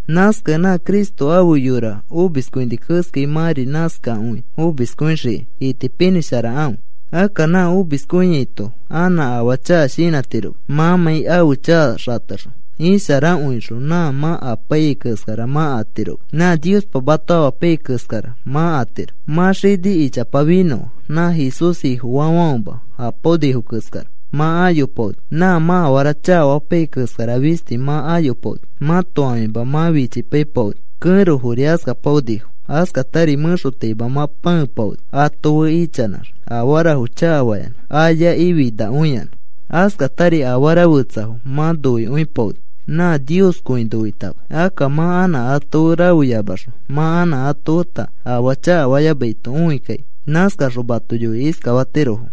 Nãskakẽ nã Cristo ãfe yora omiskõini keskai, mãri nãskai omiskõixikai itipinĩsharakãfe. Akka nã omiskõiato anã afaa chaka shinãtiroma mãmãi ãfe chaka xatexõ. Isharakõixõ nã mã apaiyai keskara mã atiroma, nã Niospa mato amapaiyai keskara mã atiro. Mã xini ichapa finõa, nã Jesús Ifofaafãfema apaonifo keskara mã ayopaoni. Nã mã afara chakafapaiyai keskara fisti mã ayopaoni. Mãto ãfimafo mã fichipaipaoni. Kẽrofori askapaonifo. Askatari mẽxotaima mã pãepaoni, ato fe ichanãx afarafo chakafayanã ayakĩ finakõiyanã. Askatari afara fetsafo mã noikõipaoni nã Nioskõi noitama. Akka mã anã ato fe rafeyamaxõ mã anã ato feta afaa chakafayamaito õikakĩ. Nãskaxõ mato yoikĩ iskafatirofo: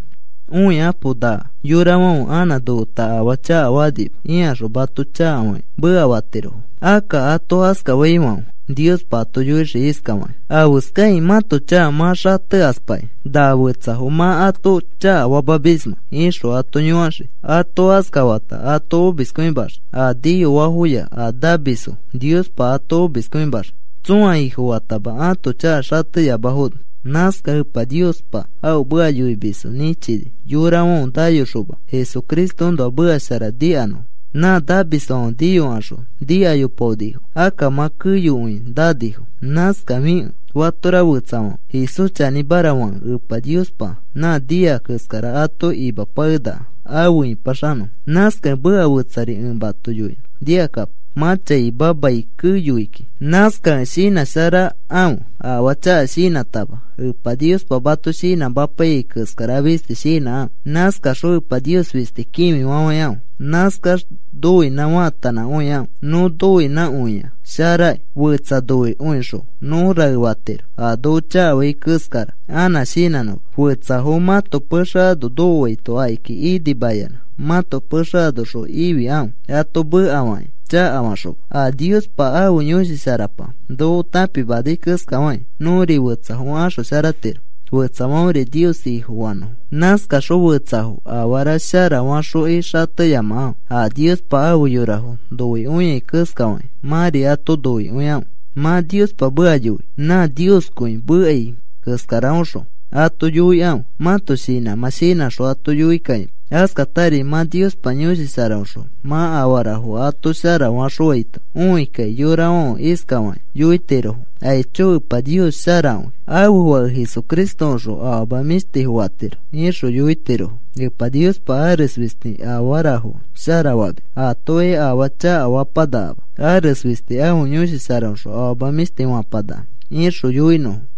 “Õikapo. Na yorafãfe anã nofeta afaa akanima,” ikaxõ mato chakafakĩ mekafatirofo. Akka ato askafaifãfe Niospa ato yoixii iskafaki: “¿Afeskakĩ mãto chaka mã xatekaspakĩ na fetsafo mã ato chakafamismẽ?” ixõ ato yõkaxii. Ato askafata ato omiskõimaxii. A niyoafoya a namisfo Niospa ato omiskõimaxii, tsõa Ifofatama ãto chaka xateyamafono. Nãskakẽ Epa Niospa ãfe meka yoimisfo nĩchini yorafãfe nayokaxoma Jesucristoõnoa meka shara nikanõfo. Nã namisfãfe niyokaxõ nikayopaonifo. Akka mã keyokõi nanifo. Nãskafikẽ fatora fetsafãfe Jesús chanĩmara fakẽ Epa Niospa nã nia keskara ato imapakenaka afe ipaxanõfo. Nãskakẽ meka fetsari ẽ mato yoinõ. Nikakapo. Mã chaima mai keyoi kiki. Nãskakẽ shinãsharakãfe, afaa chaka shinãtama. Epa Niospa mato shinãmapaiyai keskara fisti shinãkãfe. Nãskaxõ Epa Nios fisti kĩfifafãikãfe. Nãskax noinã faatanãkõikãfe nõ noinãkõia sharaki. Fetsa noikõixõ nõ rae fatiro, a noko chakafai keskara anã shinãnõma. Fetsafo mãto pexe ano nokoaito akiki inimayanã mãto pexe anoxõ ifikãfe, ato mekafakĩ chakafaxoma. A Niospa ãfe Yõshi Sharapa noko tãpimanai keskafakĩ nõri fetsafo axosharatiro fetsafãferi Nios Ifofanõfo. Nãskaxõ fetsafo afara shara faxokĩ xateyamakãfe. A Niospa afe yorafo noikõiai keskafakĩ mãri ato noikõikãfe. Mã Niospa meka yoi, nã Nioskõi mekai keskaraõxõ ato yoikãfe. Mãto shinãmã shinãxõ ato yoikakĩma. Askatari mã Niospa Yõshi Sharaõxõ mã afarafo ato shara faxõfaito õikakĩ yorafãfe iskafakĩ yoitirofo: “Aicho, Epa Nios sharakõi. Ãfe Fake Jesucristoõxõ afama mĩshtifo fatiro,” ixõ yoitirofo. “Epa Niospa ares fisti afarafo shara famis, atokai afaa chakafapanakama. Ares fisti ãfe Yõshi Sharaõxõ afama mĩshti fapanaka,” ixõ yoinõfo.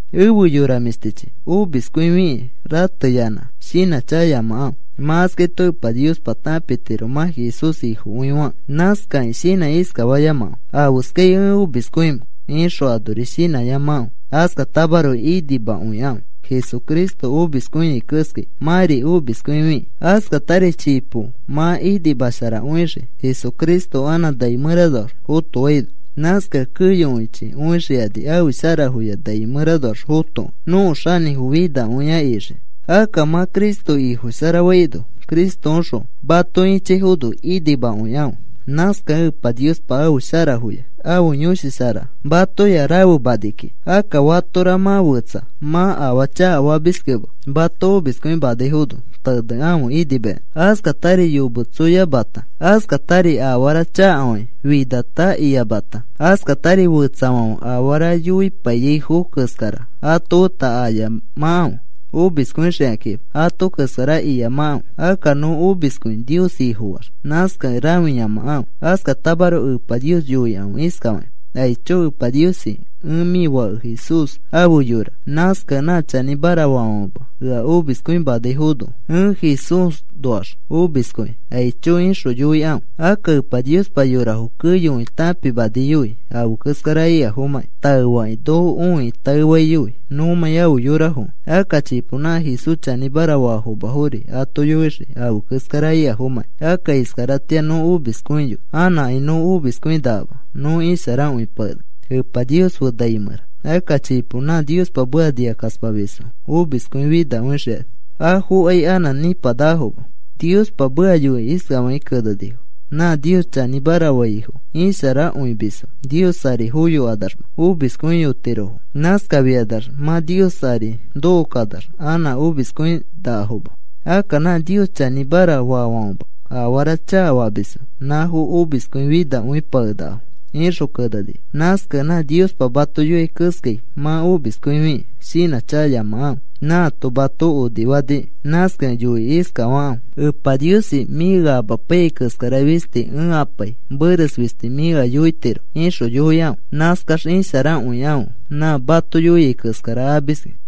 Efe yora mĩshtichi, omiskõifikĩ rateyanã shinãchakayamakãfe. Mã askaito Epa Niospa tãpitiro mã Jesús Ifokõi fakẽ. Nãskakĩ shinãkĩ iskafayamakãfe: “¿Afeskai ẽ omiskõimẽ?” ixõ anori shinãyamakãfe. Askatamaroko inimakõikãfe Jesucristo omiskõiai keskai mãri omiskõifikĩ. Askatari chipo mã inimasharakõixii Jesucristo anã nai mẽranoax fotoaino. Nãskakẽ keyokõichi õixikani ãfe sharafoya nai mẽranoax fotokẽ, nõko xanĩfo finakõi ixiki. Akka mã Cristo Ifo shara faino Cristoõxõ mato ĩchaifono inimakõikãfe. Nãskakẽ Epa Niospa ãfe sharafoya ãfe Yõshi Shara matoya rafemani kiki. Akka fatora mã fẽtsa mã afaa chakafamiskẽma mato omiskõimanaifono tenekãfe inimayanã. Askatari yometsoyamata, askatari afara chakafakĩ finata iyamata, askatari fetsafãfe afara yoipaiyaifo keskara ato feta ayamakãfe omiskõixikãkima. Ato keskara iyamakãfe. Akka nõ omiskõi Nios Ifofaax, nãskakẽ rãfiyamakãfe. Askatamaroko Epa Nios yoikãfe iskafakĩ: “Aicho Epa Niosi, ẽ mĩ Fãke Jesús afe yora. Nãskakẽ nã chanĩmara faafãfema ea omiskõimanaifono ẽ Jesúsnoax omiskõi. Aicho,” ixõ yoikãfe. Akka Epa Niospa yorafo keyokõi tãpimaniyoi afe keskara ikafomãkĩ. Taefakĩ noko õikĩ taefaiyoi nõmãi afe yorafokẽ. Akka chipo nã Jesús chanĩmara faafomafori ato yoixii afe keskara ikafomãkĩ. Akka iskaratĩa nõ omiskõiyoi, anãkai nõ omiskõinakama nõ isharakõipakenaka, Epa Nios fe nai mẽra. Akka chipo nã Niospa meka nikakaspamisfo omiskõi finakõixikani, afokai anã nĩpanakafoma. Niospa meka yoikĩ iskafakĩ kenenifo: “Nã Nios chanĩmara faifo isharakõimisfo, Nios ari foyokanaxma omiskõiyotirofo. Nãskafikanax mã Nios ari nokokanax anã omiskõinakafoma. Akka nã Nios chanĩmara faafãfema afara chakafamisfo nãfo omiskõi finakõipakenakafo,” ixõ kenenifo. Nãskakẽ nã Niospa mato yoiai keskai mã omiskõifikĩ shinãchakayamakãfe. Nãato mato onifaniki. Nãskakẽ yoikĩ iskafakãfe: “Epa Niosi, mĩ ea amapaiyai keskara fisti ẽ apai. Meres fisti mĩ ea yoitiro,” ixõ yoikãfe. Nãskax isharakõikãfe nã mato yoiai keskara amiski.